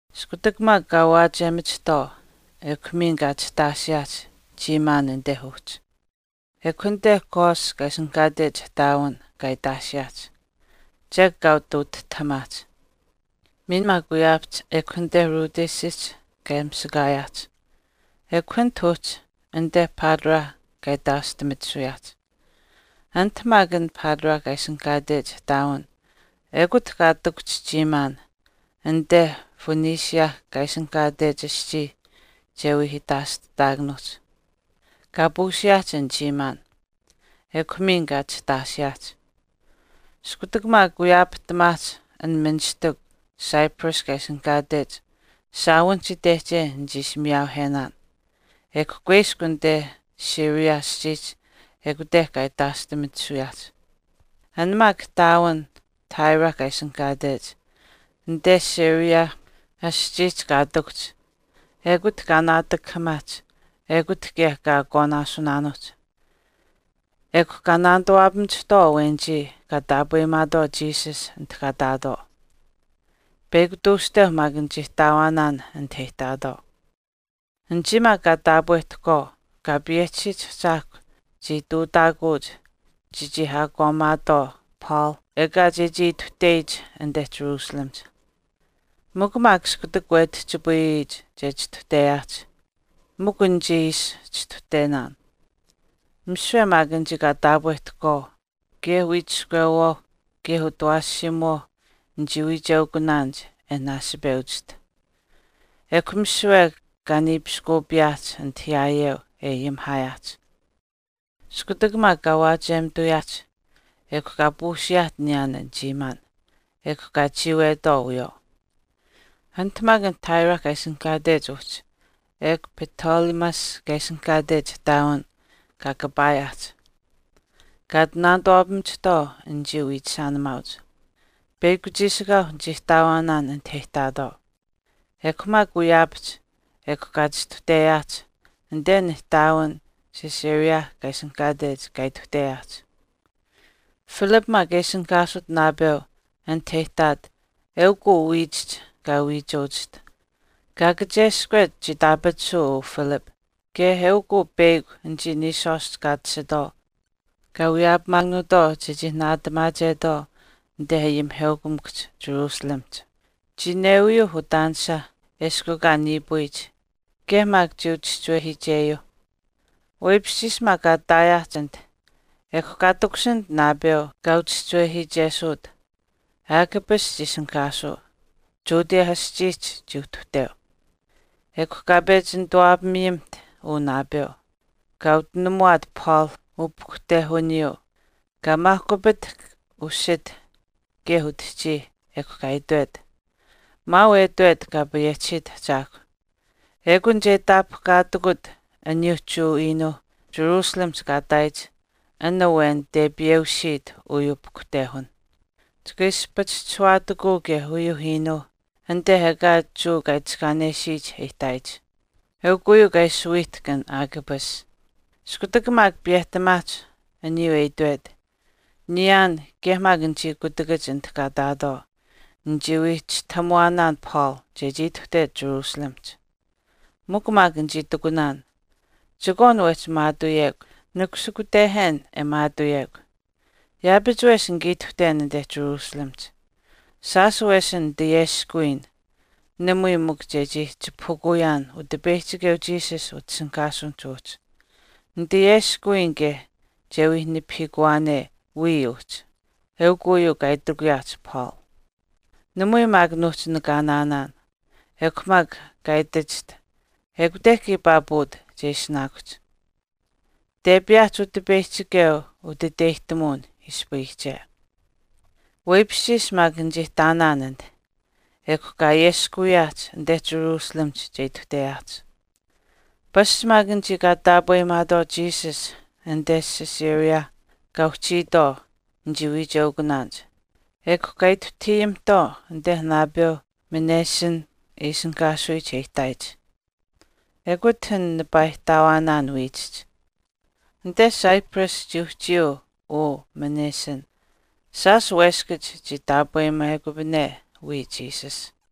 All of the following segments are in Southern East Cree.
Iskutak maak kaa waachiyemachihtwaau, ekw miin kaa chihtaashiyaahch chiimaan anit uhchi, ekw anite Cos kaa ishinihkaatech ihtaawin kaa itaashiyaahch, chek kaa ati utihtahamaahch. Miin maak wiyaapahch ekw anite Rhodesihch kaa mishakaayaahch, ekw anit uhchi anite Patara kaa itaashtimitisuyaahch. Anit maak an Patara kaa ishinihkaatech ihtaawin ekut kaa ihtakuhch chiimaan anite Phoenicia kaa ishinihkaatech aschii che wii itaashtataakanuuhch. Kaa puusiyaahch an chiimaan. Ekw miin kaa chihtaashiyaahch. Iskutak maak wiyaapahtamaahch an ministikw Cyprus kaa ishinihkaatech shaawinihch itehche nichii ishi miyaauhenaan ekw kuiskw anite Syria aschiihch ekute kaa itaashtimitisuyaahch. An maak ihtaawin Tyre kaa ishinihkaatech anite Syria aschiihch kaa ihtakuhch ekut kaa naatakahaamaahch ekut kaye kaa akwaanaasunaanuuhch. Ekw kaa nituwaapamachihtwaau anichii kaa taapweyimaatwaau Jesus anit kaa ihtaatwaau. Peyakw tuushteu maak nichii ihtaawaanaan anit e ihtaatwaau. Anichii maak kaa taapwehtahkwaau Kaa payehchisiyich Ahchaahkwa chii ihtuutaakuuch chechii ayaakwaamimaatwaau Paul ekaa chechii ituhteyich anite Jerusalemihch. Mikw maak iskutak wetihchipayihch che chistuhteyaahch, mikw nichii ishi chistuhtenaan. Misiwe maak anichii kaa taapwehtahkwaau kaye wiichiskwewaau kaye utawaashiimuwaau nichii wiicheukunaanich e naasipewachiht. Ekw misiwe kaa niipiskuupiyaahch anit yaayeu e ayimihaayaahch. Iskutak maak kaa waachiyemituyaahch, ekw kaa puusiyaahch niyaan an chiimaan, ekw kaa chiiwetwaau wiyawaau. Anit maak an Tyre kaa ishinihkaatech uhchi ekw Ptolemais kaa ishinihkaatech ihtaawin kaa kapaayaahch, kaa ati nituwaapamachihtwaau anichii wiichishaanimaauch. Peyakw chiishikaau nichii ihtaawaanaan anit e ihtaatwaau. Ekw maak wiyaapahch ekw kaa chistuhteyaahch anite an ihtaawin Caesarea kaa ishinihkaatech kaa ituhteyaahch. Philip maak e ishinihkaasut naapeu anit e ihtaat eukw uu wiichihch kaa ihtaawachiht. Kaa kacheskwet chii itaapatisuu uu Philip kaye eukw uu peyakw anichii niishwaashch kaa tashitwaau kaa wiyaapamaakanuutwaau chechii naatamaachetwaau anite ayimiheukamikuhch Jerusalemihch. Chii newiyuuh utaanisa eshkw ekaa niipuyich kaye maak chii uchischiwehiicheyuu. Weipishchiish maak kaa ihtaayaahch anit, ekw kaa takushinit naapeu kaa uchischiwehiichesuut. Agabus chii ishinihkaasuu. Judea aschiihch chii uhtuhteu. Ekw kaa pechi nituwaapamiyimiht uu naapeu, kaa utinamuwaat Paul upahkuhtehuniyuu, kaa maahkupitahk usith kaye utihchiih ekw kaa itwet, “Maau e itwet Kaa payehchisiit Ahchaahkw, Ekun che itaapahkaatikut aniyuu Jewa iinuu Jerusalemihch kaa ihtaayich an awen tepiyeusiit uyuu pahkuhtehun. Chika ishi pachischishuwaatikuu kaye uyuu iinuuh anite ekaa Jewa kaa itiskaanesiyich e ihtaayich.” Eukw uyuu kaa ishi wiihtahk an Agabus. Iskutak maak piyehtamaahch aniyuu e itwet, niyaan kaye maak anichii kutakach anit kaa ihtaatwaau, nichii wii chistahamuwaanaan Paul chechii ituhtet Jerusalemihch. Mikw maak nichii itikunaan, “Chekwaan wehchi maatuuyekw, nikushikutehen e maatuuyekw. Yaapach wesh nika ituhten anite Jerusalemihch. Shaash wesin nitayeskuwiin namui mikw chechii chipahukuyaan Utipeyihchikeu Jesus utishinihkaasuwin uhchi, nitayeskuwiin kaye che wii nipahiikuwaane wiya uhchi.” Eukw uyuu kaa itikuyaahch Paul. Namui maak nuuhchii nakaanaanaan, ekw mikw kaa itachiht, “Ekute kiipaa puut che ishinaakuhch. Tepiyaahch Utipeyihchikeu utiteyihtamuwin ispayiyiche.” Weipishchiish maak nichii ihtaanaan anit, ekw kaa ayeskuwiyaahch anite Jerusalemihch che ituhteyaahch. Pasch maak anichii kaa taapweyimaatwaau Jesus anite Caesarea kaa uhchiitwaau nichii wiicheukunaanich, ekw kaa ituhtahiyimihtwaau anite naapeu Mnason e ishinihkaasuyich e ihtaayich. Ekut an nipaa ihtaawaanaan wiichihch. Anite Cyprus chii uhchiyuu uu Mnason. Shaash weskach chii taapweyimekupane wiya Jesus.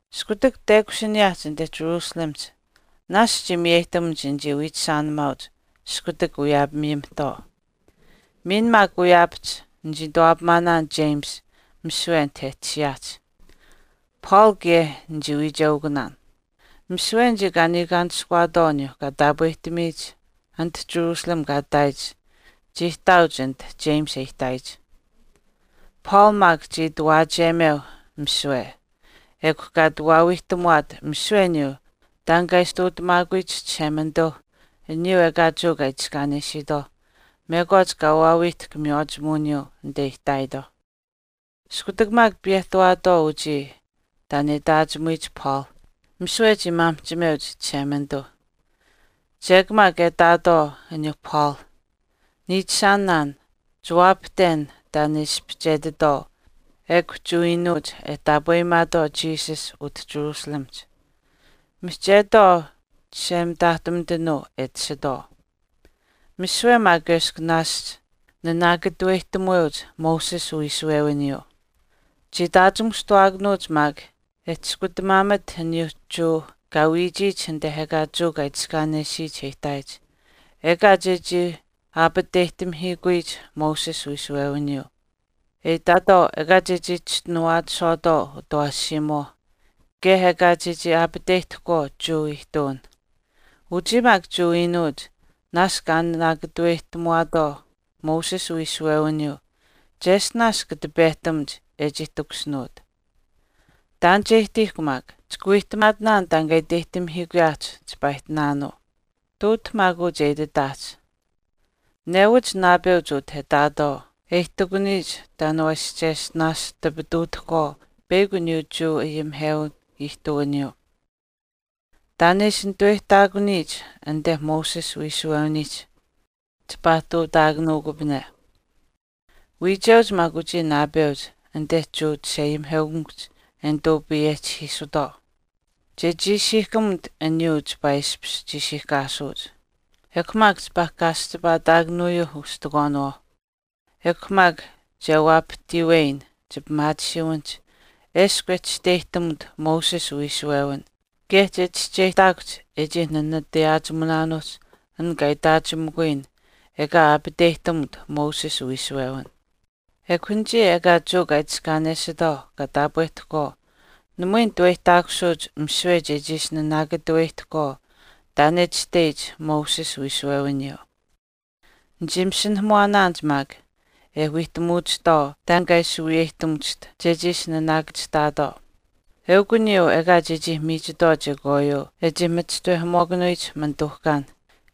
Iskutak tekushiniyaahch anite Jerusalemihch, naashch chii miyeyihtamuch anichii wiichishaanimaauch iskutak wiyaapamiyimihtwaau. Miin maak wiyaapahch nichii nituwaapamaanaan James misiwe anit e tashiyaahch. Paul kaye nichii wiicheukunaan. Misiwe anichii kaa niikaanishkuwaatwaau aniyuu kaa taapwehtamiyich anit Jerusalemihch kaa ihtaayich chii ihtaauch anit James e ihtaayich. Paul maak chii ati waachiyemeu misiwe, ekw kaa ati waawiihtamuwaat misiwe aniyuu taan kaa ishi ihtuutamaakuyich Chishemanituu aniyuu ekaa Jewa kaa itiskaanesiitwaauh mekwaach kaa waawiihtahk miywaachimuwiniyuu anite e ihtaayitwaauh. Iskutak maak piyehtawaatwaau uchii taan e itaachimuyich Paul misiwe chii maamihchimeuch Chishemanituu. Chek maak e itaatwaau aniyuu Paul, “Niichishaanaan, chiwaapahten taan e ispihchetitwaau ekw Jewa iinuuch e taapweyimaatwaau Jesus utah Jerusalemihch, mihchetwaau chishemitaahtumitanuu e tashitwaau. Misiwe maak eshkw naashch naanaakatuweyihtamuweuch Moses uwiishuwewiniyuu. Chii itaachimushtuwaakanuuch maak e chiskutamaamat aniyuu Jewa kaa wiichiyich anite ekaa Jewa kaa itiskaanesiyich e ihtaayich ekaa chechii aapateyihtamihiikuyich Moses uwiishuwewiniyuu, e itatwaau ekaa chechii chischinuwaachishwaatwaau utawaashiimuwaau kaye ekaa chechii aapateyihtahkwaau Jewa ihtuwinh. Uchii maak Jewa iinuuch naashch kaa nanaakataweyihtamuwaatwaau Moses uwiishuwewiniyuu cheshtinaash kata pehtamuch e chii takushinuut. Taan che ihtiihkw maak. Chika wiihtamaatinaan taan kaa iteyihtamihiikuyaahch chipaa ihtinaanuu. Ihtuut maak uu che ititaahch. Newach naapeuch utah e ihtaatwaau e ihtakuniyich taan waa ishi cheshtinaash tipituutahkwaau peyakw aniyuu Jewa ayimihewin ihtuwiniyuu, taan e ishi nituweyihtaakuniyich anite Moses uwiishuwewiniihch chipaa ihtuutaakanuukupane. Wiicheuch maak uchii naapeuch anite Jewa chisheayimiheukamikuhch e nituu payehchihiisutwaau, che chiishiihkamut aniyuu chipaa ishpish chiishiihkaasuuch, ekw maak chipaa kaaschipaataakanuyuuh ustikwaaniwaauh. Ekw maak che waapahtiiweyin chipimaatisiiwinihch eshkw e chisteyihtamut Moses uwiishuwewin kaye che chischeyihtaakuhch e chii nanatayaachimunaanuuch an kaa itaachimikuyin ekaa aapateyihtamut Moses uwiishuwewin. Ekw anichii ekaa Jewa kaa itiskaanesitwaau kaa taapwehtahkwaau namui nituweyihtaakusuuch misiwe chechii ishi naanaakatuweyihtahkwaau taan e itashteyich Moses uwiishuwewiniyuu. Nichii masinahamuwaanaanich maak e wiihtamuwachihtwaau taan kaa ishi wiyeyihtamuwachiht chechii ishi naanaakachihtaatwaau, eukw aniyuu ekaa chechii miichitwaau chekwaayuu e iskupayiyich e chii machishtawehamuwaakanuyich manituuhkaan,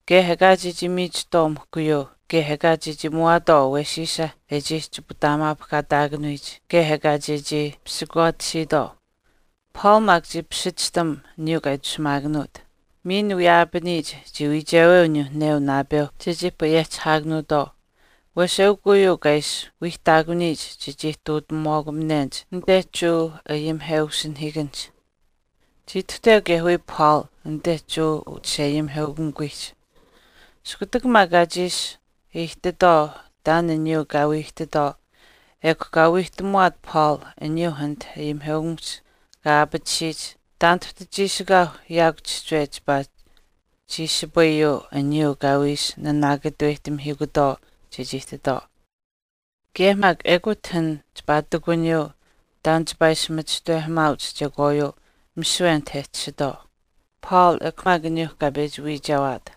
kaye ekaa chechii miichitwaau mihkuyuu kaye ekaa chechii muwaatwaau awesiisa e chii chiputaamaapahkaataakanuyich kaye ekaa chechii pisikwaatisiitwaau.” Paul maak chii pishichihtam aniyuu kaa itashumaakanuut. Miin wiyaapaniyich chii wiicheweu aniyuu neu naapeuh chechii payehchihaakanuutwaau wesh eukw uyuu kaa ishi wiihtaakuniyich chechii ihtuutamuwaakupanenich anite Jewa ayimiheusinahiikanihch. Chii ituhteu kaye wiya Paul anite Jewa uchisheayimiheukamikuwiihch. Iskutak maak kaa chiish aihtitwaau taan aniyuuh kaa wii ihtitwaau ekw kaa wiihtamuwaat Paul aniyuu anite ayimiheukamikuhch kaa ayaapatisiyich taan tahtu chiishikaau yaakw chihchiwe chipaa chiishipayuu aniyuu kaa wii ishi naanaakataweyihtamihiikutwaau chechii ihtitwaau. Kaye maak ekut an chipaa ihtakuniyuu taan chipaa ishi machishtawehamaauch chekwaayuu misiwe anit e tashitwaau, Paul ekw maak aniyuu kaa pechi wiichewaat.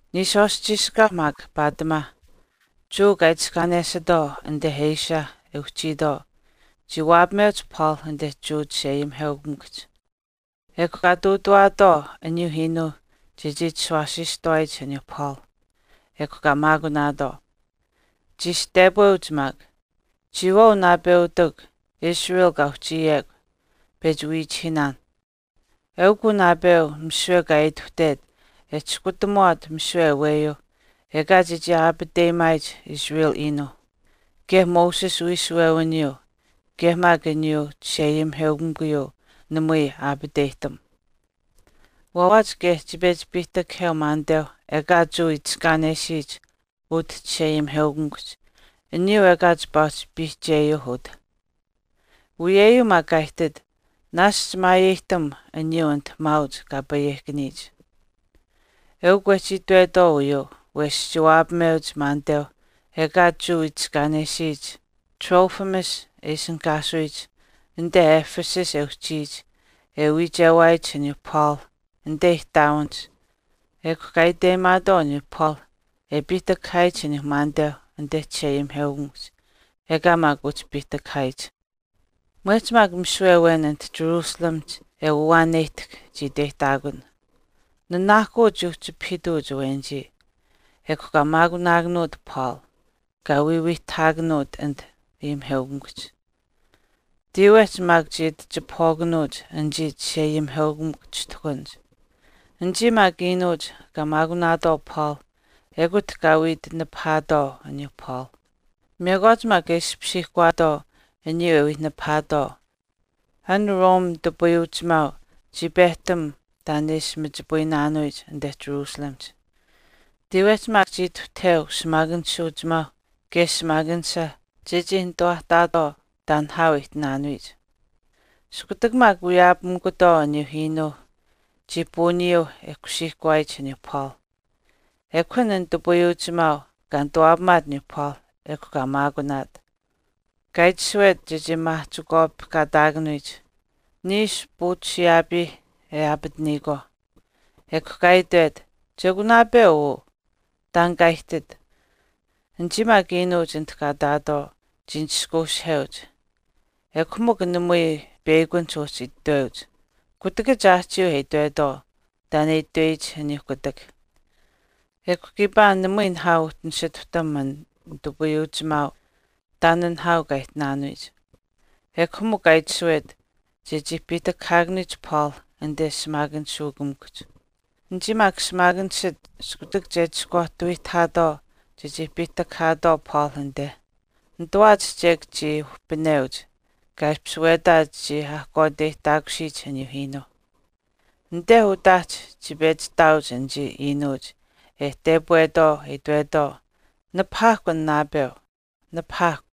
Niishwaashch chiishikaau maak paatimaa Jewa kaa itiskaanesitwaau anite Asia e uhchiitwaau chii waapameuch Paul anite Jewa chisheayimiheukamikuhch. Ekw kaa ihtuutawaatwaau aniyuu iinuu chechii chishuwaasiistuwaayich aniyuu Paul, ekw kaa maakunaatwaau. Chii ishi tepweuch maak, “Chiyawaau naapeutikw Israel kaa uhchiyekw, pechi wiichihiinaan, eukw uu naapeu misiwe kaa aituhtet e chiskutamuwaat misiwe aweyuu ekaa chechii aapateyimaayich Israel iinuu, kaye Moses uwiishuwewiniyuu kaye maak uyuu Chisheayimiheukamikuyuu namui aapateyihtam. Waawaach kaye chii pechi piihtakaheu maaniteu ekaa Jewa itiskaanesiyich utah chisheayimiheukamikuhch aniyuu ekaa chipaa uhchi piihcheyuu utah. Uyeyuu maak kaa ihtit naashch maayeyihtam aniyuu anit maauch kaa payehkaniyich.” Eukw wehchii itwetwaau uyuu wesh chii waapameuch maaniteu ekaa Jewa itiskaanesiyich Trophimus e ishinihkaasuyich anite Ephesus e uhchiyich e wiichewaayich aniyuu Paul anite ihtaawinihch ekw kaa iteyimaatwaau aniyuu Paul e piihtakahaayich aniyuu maaniteu anite Chisheayimiheukamikuhch, ekaa maak uhchi piihtakahaayich. Mwehch maak misiwe awen anit jerusalemihch e waawaaneyihtahk chii iteyihtaakun. Nanaahkuu chii uhchipahiituuch awenichii. Ekw kaa maakunaakanuut Paul, kaa wiiwiitaapaataakanuut anit ayimiheukamikuhch. Tiiwehch maak chii ati chipahwaakanuuch anichii chisheayimiheukamikw chishtuhkanich. Anichii maak iinuuch kaa maakunaatwaau Paul ekut kaa wii ati nipahaatwaau aniyuu Paul. Mekwaach maak e ishpishiihkawaatwaau aniyuu e wii nipahaatwaau, an Rome nitupayuuchimaau chii pehtam taan e ishi machipayinaanuyich anite Jerusalemihch. Tiiwehch maak chii ituhtaheu shimaakanishuuchimaauh kaye shimaakanisha chechii nitawaahtaatwaau taan nihaau e ihtinaanuyich. Iskutak maak wiyaapamikutwaau aniyuu iinuu chii puuniyuuh e kusiihkuwaayich aniyuu Paul. Ekw an nitupayuuchimaau kaa nituwaapamaat aniyuu Paul ekw kaa maakunaat. Kaa itashuwet chechii maahchikwaapihkaataakanuyich, niishu puuchisiyaapiih e aapataniyikwaauh. Ekw kaa itwet, “Chekw naapeu uu, taan kaa ihtit.” Anichii maak iinuuch anit kaa ihtaatwaau chii nishkuushiheuch. Ekw mikw namui peyakunihch uhchi itweuch, kutakach aahchiiuh e itwetwaau taan e itweyich aniyuuh kutak. Ekw kiipaa namui nihaau uhchii nisituhtam an nitupayuuchimaau taan nihaau kaa ihtinaanuyich, ekw mikw kaa itashuwet chechii piihtakahaakanuyich Paul anite shimaakanishuukamikuhch. Anichii maak shimaakanishach iskutak che ati iskwaahtawiitwaau chechii piihtakahaatwaau Paul anite, nitawaach chek chii uhpineuch kaa ishpish wetaach chii ahkwaateyihtaakusiyich aniyuu iinuu. Anite utaahch chii pechi ihtaauch anichii iinuuch e tepwetwaau e itwetwaau, “Nipahaahkw an naapeu. Nipahaakw.”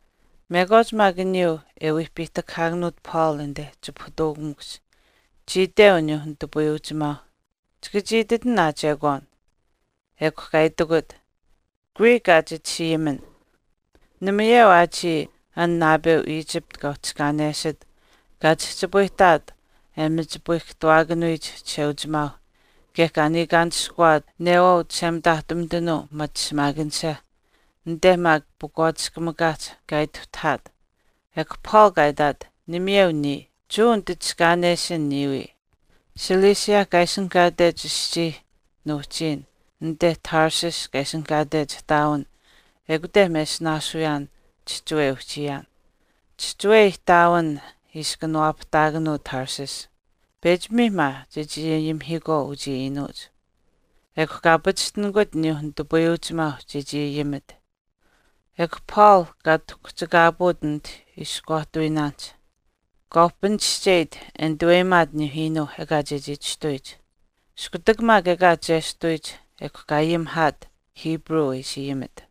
Mekwaach maak aniyuu e wii piihtakahaakanuut Paul anite chipahutuukamikuhch chii iteu aniyuu nitupayuuchimaau, “Chika chii ititin aa chekwaan.” Ekw kaa itikut, “Greek aa chit ishi ayimin. Namayeu aa chiya an naapeu Egypt kaa itiskaanesit kaa chihchipayihtaat e machipayihkahtawaakanuyich Chisheuchimaau kaye kaa niikaanishkuwaat neuwaau chishemitaahtumitanuu machi shimaakanisha, anite maak pakwaatiskamikaahch kaa ituhtahaat.” Ekw Paul kaa itaat, “Namayeu niya. Jewa nititiskaanesin niya wii, Cilicia kaa ishinihkaatech aschii nuuhchiin anite Tarsus kaa ishinihkaatech ihtaawin ekute mesinaasuyaan chihchiwe e uhchiyaan. Chihchiwe ihtaawin ishi kanawaapahtaakanuu Tarsus. Pechi mii maa chechii ayimihiikwaau uchii iinuuch.” Ekw kaa pachishtinikut aniyuu nitupayuuchimaau chechii ayimit. Ekw Paul kaa tahkuhchikaapuut anit iskwaahtawiinaanihch. Kaa uhpinischeyit e nituweyimaat aniyuu iinuu ekaa chechii chistuyich. Iskutak maak ekaa chestuyich, ekw kaa ayimihaat Hebrew e ishi ayimit.